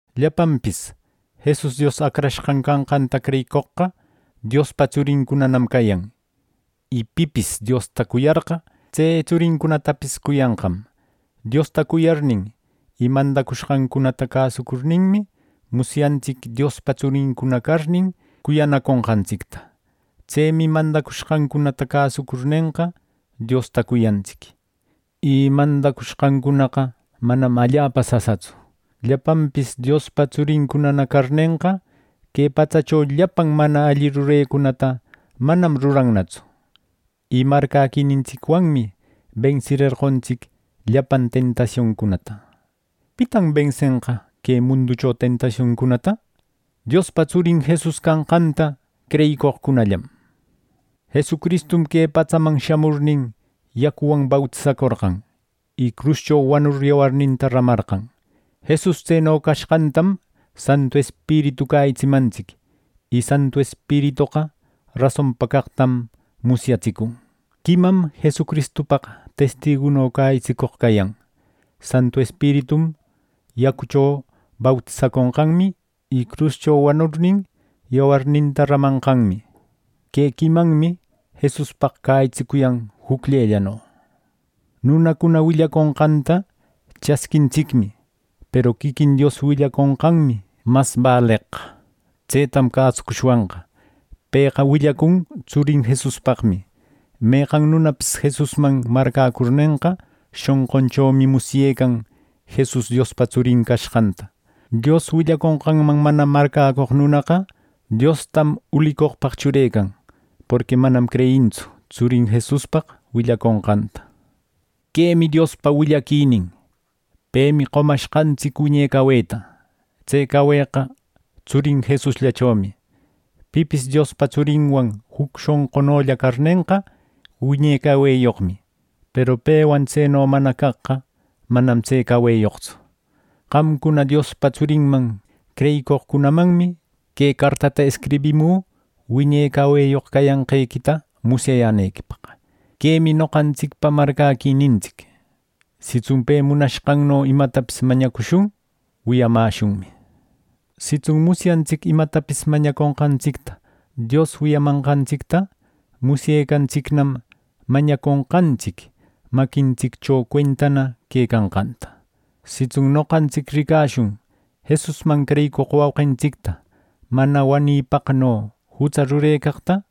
Llapanpis Jesus Dios Acrashqan canqanta creyicoqqa Diospa tsurincunanam cayan. Y pipis Diosta cuyarqa, tse tsurincunatapis cuyanqam. Diosta cuyarnin y mandacushqancunata cäsucurninmi, musyantsic Diospa tsurincuna carnin cuyanaconqantsicta. Tsemi mandacushqancunata cäsucurnenqa, Diosta cuyantsic. Y mandacushqancunaqa manam allapa sasatsu. Llapanpis Diospa tsurincunana carnenqa, que patsacho llapan mana alli rurecunata manam rurannatsu. Y marcäquinintsicwanmi bensirerqontsic llapan tentasioncunata. ¿Pitan bensenqa que munducho tentasioncunata: Diospa Tsurin Jesus canqanta creyicoqcunallam! Jesucristum que patsaman shamurnin, yacuwan bautisacorqan, y cruscho wanur yawarninta ramarqan. Jesus tseno cashqantam Santu Espiritu cäyitsimantsic. Y Santu Espiritoqa rasonpa caqtam musyatsicun. Quimam Jesucristupaq testiguno cäyitsicoq cayan: Santu Espiritum, yacucho bautisaconqanmi, y cruscho wanurnin, yawarninta ramanqanmi. Que quimanmi Jesuspaq cäyitsicuyan jucllellano. Nunacuna willaconqanta chasquintsicmi. Peru quiquin Dios willaconqanmi mas baleqqa. Tsetam cäsucushwanqa. Pëqa willacun Tsurin Jesuspaqmi. Meqan nunapis Jesusman marcäcurnenqa, shonqunchomi musyecan Jesus Diospa Tsurin cashqanta. Dios willaconqanman mana marcäcoq nunaqa, Diostam ulicoqpaq churecan, porqui manam creyintsu Tsurin Jesuspaq willaconqanta. Quemi Diospa willaquinin: Pemi qomashqantsic wiñe caweta. Tse caweqa Tsurin Jesusllachomi. Pipis Diospa Tsurinwan juc shonqunolla carnenqa, wiñe caweyoqmi; peru pewan tseno mana caqqa, manam tse caweyoqtsu. Qamcuna Diospa Tsurinman creyicoqcunamanmi que cartata escribimü wiñe caweyoq cayanqequita musyayänequipaq. Quemi noqantsicpa marcäquinintsic: Sitsun pe munashqanno imatapis mañacushun, wiyamäshunmi. Sitsun musyantsic imatapis mañaconqantsicta Dios wiyamanqantsicta, musyecantsicnam mañaconqantsic maquintsiccho cuentana quecanqanta. Sitsun noqantsic ricashun Jesusman creyicoq wauqintsicta mana wanipaqno jutsa rurecaqta,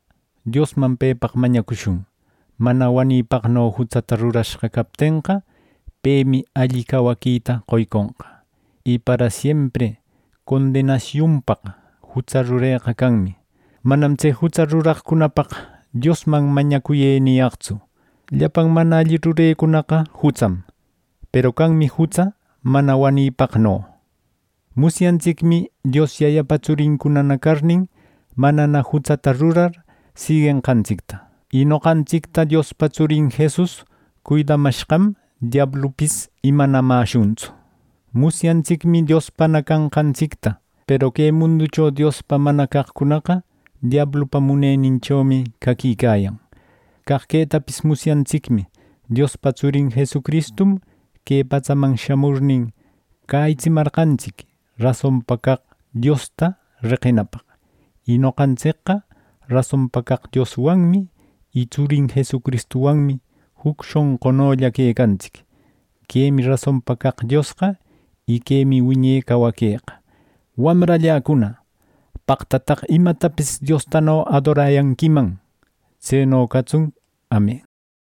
Diosman pepaq mañacushun. Mana wanipaqno jutsata rurashqa captenqa, pemi alli cawaquita qoyconqa. Y parasiempri condenasiunpaq jutsa rureqa canmi. “Manam tse jutsa ruraqcunapaq Diosman mañacuyë” niyaqtsu. Llapan mana alli rurecunaqa jutsam. Peru canmi jutsa mana wanipaqno. Musyantsicmi Dios Yayapa tsurincunana carnin, manana jutsata rurar siguenqantsicta. Y noqantsicta Diospa Tsurin Jesus cuidamashqam, diablupis imanamäshuntsu. Musyantsicmi Diospana canqantsicta. Peru que munducho Diospa mana caqcunaqa diablupa muneninchomi caquicayan. Caq quetapis musyantsicmi Diospa Tsurin Jesucristum que patsaman shamurnin, cäyitsimarqantsic rasonpa caq Diosta reqinapaq. Y noqantsicqa rasonpa caq Dioswanmi y Tsurin Jesucristuwanmi juc shonqunolla quecantsic. Quemi rasonpa caq Diosqa, y quemi wiñe cawaqueqa. Wamralläcuna, ¡paqtataq imatapis Diostano adorayanquiman! ˻Tseno catsun, Amen˼